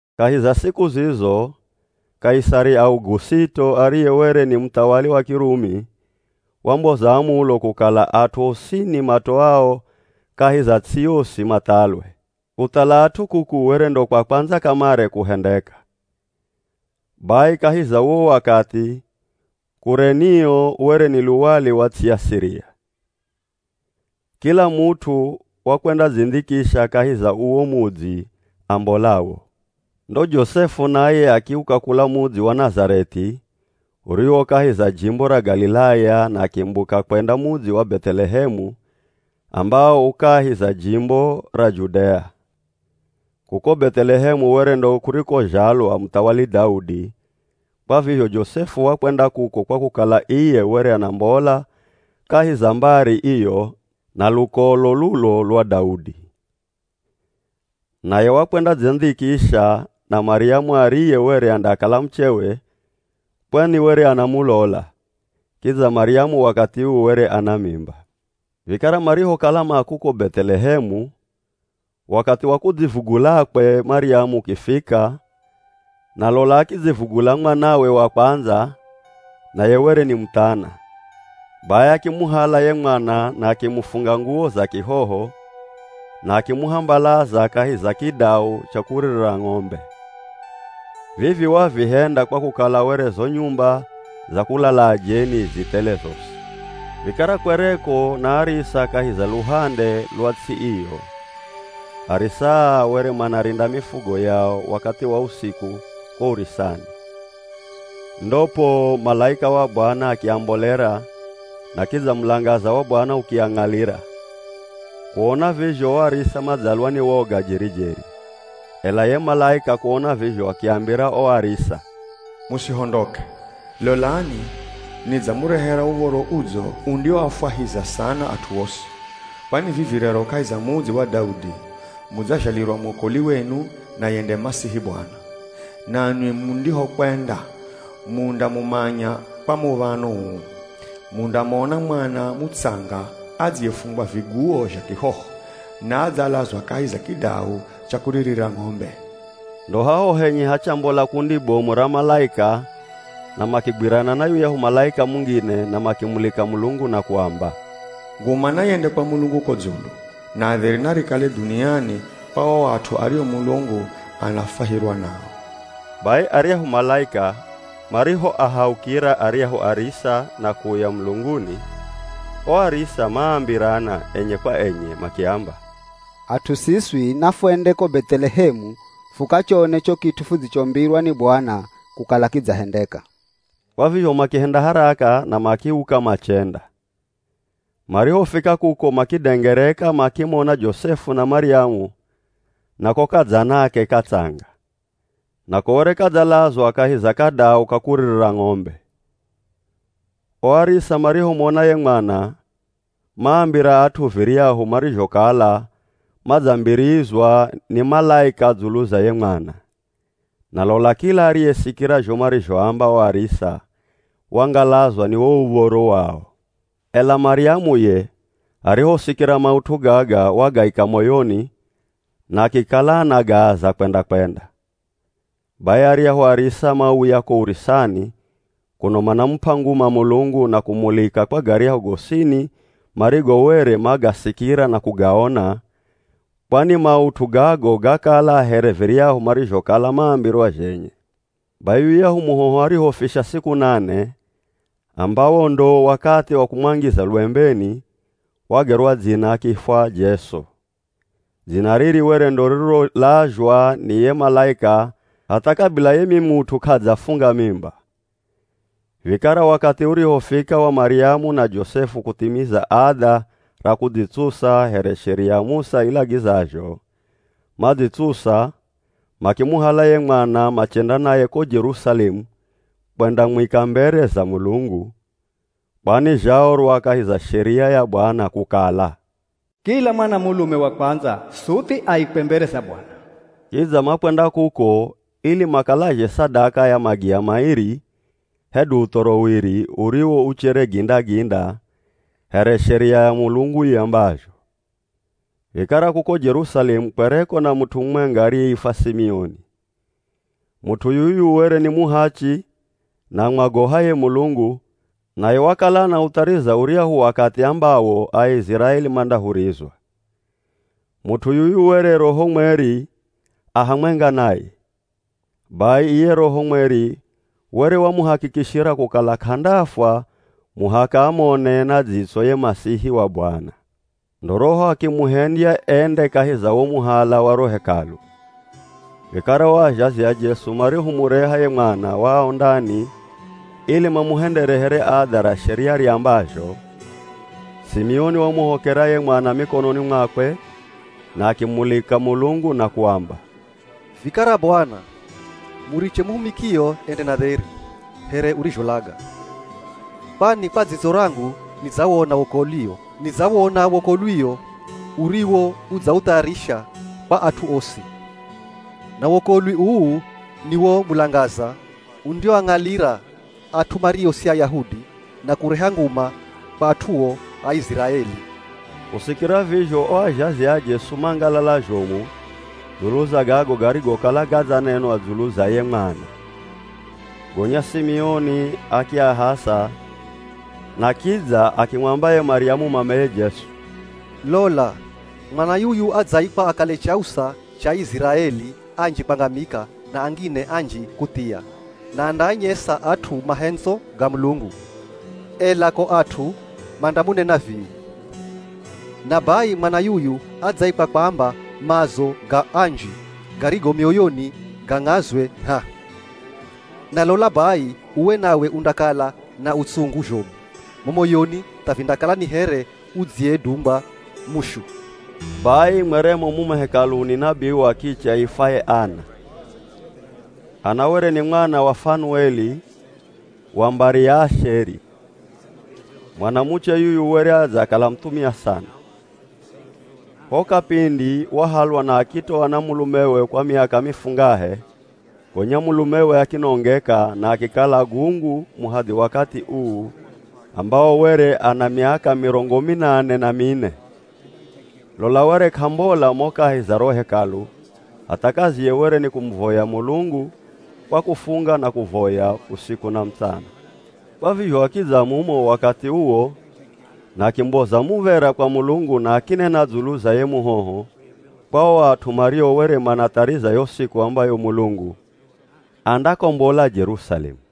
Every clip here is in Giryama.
Kahi za siku zizo Kaisari Augusito ariye were ni muthawali wa Kirumi, wamboza amulo kukala at'u osini matoao kahi za ts'i yosi mathalwe. (Kuthala at'u kuku were ndo kwa kwandza kamare kuhendeka. Bai kahi za uwo wakathi, Kurenio were ni luwali wa ts'i ya Siria.) Kila mut'u wakwendadzindhikisha kahi za uwo mudzi ambolawo. Ndo Josefu naye akiuka kula mudzi wa Nazareth'i uriwo kahi za jimbo ra Galilaya na akimbuka kwenda mudzi wa Beth'elehemu ambawo u kahi za jimbo ra Judea. Kuko Beth'elehemu were ndo kurikozhalwa muthawali Daudi, kwa vizho Josefu wakwenda kuko kwa kukala iye were anambola kahi za mbari iyo na lukolo lulo lwa Daudi. Naye wakwendadzindhikisha na Maryamu ariye were andakala muchewe kwani were anamulola, kidza Maryamu wakathi uu were ana mimba. Vikara marihokala ma kuko Beth'elehemu, wakathi wa kudzivugulakwe Maryamu ukifika, na lola akidzivugula mwanawe wa kwandza, naye were ni muthana. Bai akimuhala ye mwana na akimufunga nguwo za kihoho na akimuhambalaza kahi za kidau cha kuririra ng'ombe. Vivi wavihenda kwa kukala were zo nyumba za kulala ajeni zi thele zosi. Vikara kwereko na arisa kahi za luhande lwa ts'i iyo. Arisa aa were manarinda mifugo yao wakathi wa usiku ko urisani. Ndo poo malaika wa Bwana akiambolera na kidza mulangaza wa Bwana ukiang'alira. Kuona vizho o arisa madzalwa ni woga jeri-jeri. Ela ye malaika kuona vizho akiambira o arisa, “Musihondoke, lolani nidzamurehera Uv̱oro Udzo undioafwahiza sana at'u osi. Kwani vivi rero kahi za mudzi wa Daudi mudzazhalirwa mwokoli wenu, naye nde Masihi Bwana. Nanwi mundihokwenda, mundamumanya kwa muv̱ano uu: Mundamona mwana mutsanga adziyefungwa viguwo zha kihoho na adzalazwa kahi za kidau cha kuririra ng'ombe.” Ndo haho henye hachambola kundi bomu ra malaika na makigwirana na yuyahu malaika mungine na makimulika Mulungu na kuamba, “Nguma nayende kwa Mulungu ko dzulu, na dheri narikale dhuniani kwa o at'u ario Mulungu anafwahirwa nao!” Bai aryahu malaika marihoahaukira aryahu arisa na kuuya mulunguni, o arisa maambirana enye kwa enye makiamba, “At'u siswi nafwende ko Beth'elehemu fukachone cho kit'u fudzichombirwa ni Bwana kukala kidzahendeka.” Kwa vizho makihenda haraka na makiuka machenda. Marihofika kuko makidengereka makimona Josefu na Maryamu na ko kadzanake katsanga. Nako were kadzalazwa kahi za kadau ka kuririra ng'ombe. O arisa marihomona ye mwana, maambira at'u viryahu marizhokala madzambirizwa ni malaika dzulu za ye mwana. Na lola kila ariyesikira zho marizhoamba o arisa wangalazwa ni wo uv̱oro wao. Ela Maryamu ye arihosikira maut'u gaga wagaika moyoni na akikala anagaaza kwenda-kwenda. Bai aryahu arisa mauya ko urisani, kuno manamup'a nguma Mulungu na kumulika kwa garyahu gosini marigo were magasikira na kugaona, kwani maut'u gago gakala here viryahu marizhokala mambirwa zhenye. Bai yuyahu muhoho arihofisha siku nane, ambawo ndo wakathi wa kumwangiza lwembeni, wagerwa dzina akiifwa Jesu. Dzina riri were ndo ririrolazhwa ni ye malaika hatha kabila ye mimut'u k'adzafunga mimba. Vikara wakathi urihofika wa Maryamu na Josefu kuthimiza adha ra kudzitsusa here Sheria ya Musa ilagizazho, madzitsusa, makimuhala ye mwana machenda naye ko Jerusalemu kwendamwika mbere za Mulungu, (kwani zhaorwa kahi za sheria ya Bwana kukala, “Kila mwana mulume wa kwandza suthi aikwe mbere za Bwana.”) Kidza makwenda kuko ili makalazhe sadaka ya magiya mairi hedu uthoro wiri uriwo uchere ginda-ginda, here sheria ya Mulungu iambazho. Vikara kuko Jerusalemu kwereko na mut'u mumwenga ariyeifwa Simioni. Mut'u yuyu were ni muhachi na amwagohaye Mulungu, naye wakala anauthariza uryahu wakathi ambawo Aiziraeli mandahurizwa. Mut'u yuyu were Roho Mweri a hamwenga naye. Bai iye Roho Mweri were wamuhakikishira kukala k'andafwa muhaka amone na dzitso ye Masihi wa Bwana. Ndo Roho akimuhendya ende kahi za wo muhala wa ro Hekalu, vikara o azhazi a Jesu marihomureha ye mwana wao ndani ili mamuhendere here adha ra sheria riambazho, Simioni wamuhokera ye mwana mikononi mwakwe na akimulika Mulungu na kuamba, “Vikara Bwana, muriche muhumikio ende na dheri, here urizholaga. Kwani kwa dzitso rangu nidzawona wokolwio, Nidzawona wokolwio uriwo udzauthayarisha kwa at'u osi. Na wokolwi uu ni wo mulangaza undioang'alira at'u mario si Ayahudi, na kureha nguma kwa at'uo Aiziraeli.” Kusikira vizho o azhazi a Jesu mangalala zhomu dzulu za gago garigokala gadzanenwa dzulu za ye mwana. Gonya Simioni akiahasa na kidza akimwamba ye Maryamu mameye Jesu, “Lola, mwana yuyu adzaikwa akale chausa cha Aiziraeli anji kwangamika na angine anji kuthia, na andaanyesa at'u mahendzo ga Mulungu, ela ko at'u mandamunena vii. Na bai mwana yuyu adzaikwa kwamba maazo ga anji garigo mioyoni gang'azwe ngh'aa. Na lola bai uwe nawe undakala na utsungu zhomu mo moyoni tha vindakala ni here udziyedungwa mushu.” Bai mweremo mumo Hekaluni nabii wa kiche aifwaye Ana. Ana were ni mwana wa Fanueli wa mbari ya Asheri. Mwanamuche yuyu were adzakala muthumia sana. Ho kapindi wahalwa na akitoa na mulumewe kwa miaka mifungahe, gonya mulumewe akinongeka na akikala gungu muhadhi wakathi uu ambawo were ana miaka mirongo minane na mine. Lola were k'ambola mo kahi za ro Hekalu hatha kaziye were ni kumuvoya Mulungu kwa kufunga na kuvoya usiku na mutsana. Kwa vizho akidza mumo wakathi uwo na akimboza muv̱era kwa Mulungu na akinena dzulu za ye muhoho kwa o at'u mario were manathariza yo siku ambayo Mulungu andakombola Jerusalemu.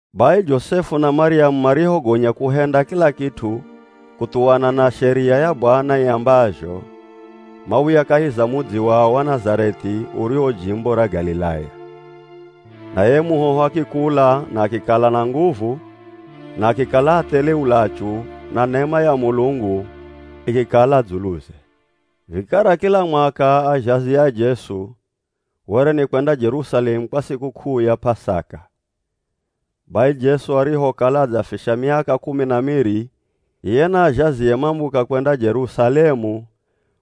Bai Josefu na Maryamu marihogonya kuhenda kila kit'u kuthuwana na sheria ya Bwana iambazho, mauya kahi za mudzi wao wa Nazareth'i uriwo jimbo ra Galilaya. Naye ye muhoho akikula na akikala na nguvu na akikala athele ulachu, na nema ya Mulungu ikikala dzuluze. Vikara kila mwaka azhazi a Jesu were ni kwenda Jerusalemu kwa sikuk'uu ya P'asaka. Bai Jesu arihokala adzafisha miaka kumi na miri, iye na azhazie mambuka kwenda Jerusalemu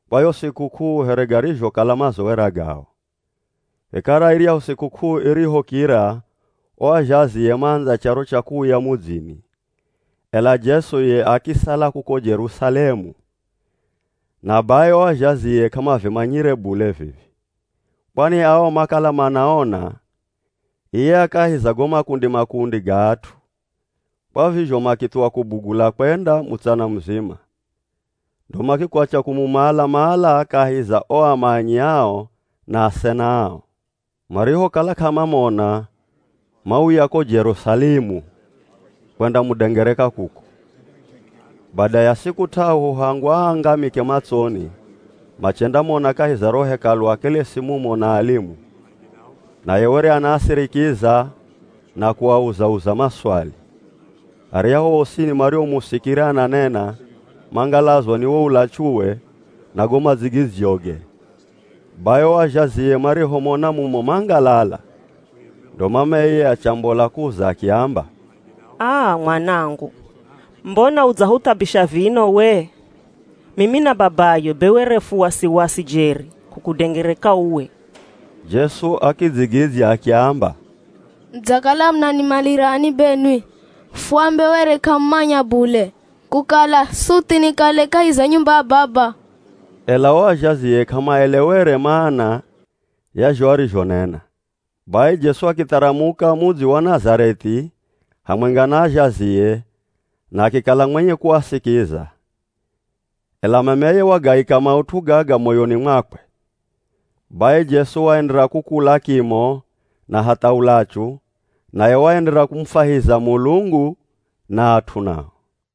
kwa yo sikuk'uu here garizhokala mazowera gao. Vikara iryahu sikuk'uu irihokira, o azhazie maandza charo cha kuuya mudzini, ela Jesu ye akisala kuko Jerusalemu. Na bai o azhazie k'amavimanyire bule vivi. Kwani ao makala manaona iye a kahi za go makundi-makundi ga at'u, kwa vizho makithuwa kubugula kwenda, mutsana muzima, ndo makikwatya kumumala-mala kahi za o amanyi ao na asena ao. Marihokala k'amamona, mauya ko Jerusalemu kwendamudengereka kuko. Bada ya siku t'ahu hangu aangamike matsoni, machendamona kahi za ro Hekalu akelesi mumo na alimu, naye were anaasirikiza na kuauza-uza maswali. Aryahu osini mariomusikira ananena mangalazwa ni wo ulachuwe na go madzigidzyoge. Bai o azhazie marihomona mumo mangalala. Ndo mameye achambola kuuza akiamba, “Aa, Mwanangu, mbona udzahuthabisha vino we? Mimi na babayo be were fu wasiwasi jeri kukudengereka uwe.” Jesu akidzigidzya akiamba, “Mudzakala munanimalirani benwi? Fuambe were k'amumanya bule kukala suthi nikale kahi za nyumba ya Baba?” Ela o azhazie k'amaelewerwe mana ya zho arizhonena. Bai Jesu akitharamuka mudzi wa Nazareth'i hamwenga na azhazie, na akikala mwenye kuasikiza. Ela mameye wagaika maut'u gaga moyoni mwakwe. Bai Jesu waenderera kukula kimo na hatha ulachu, naye waenderera kumufwahiza Mulungu na at'u nao.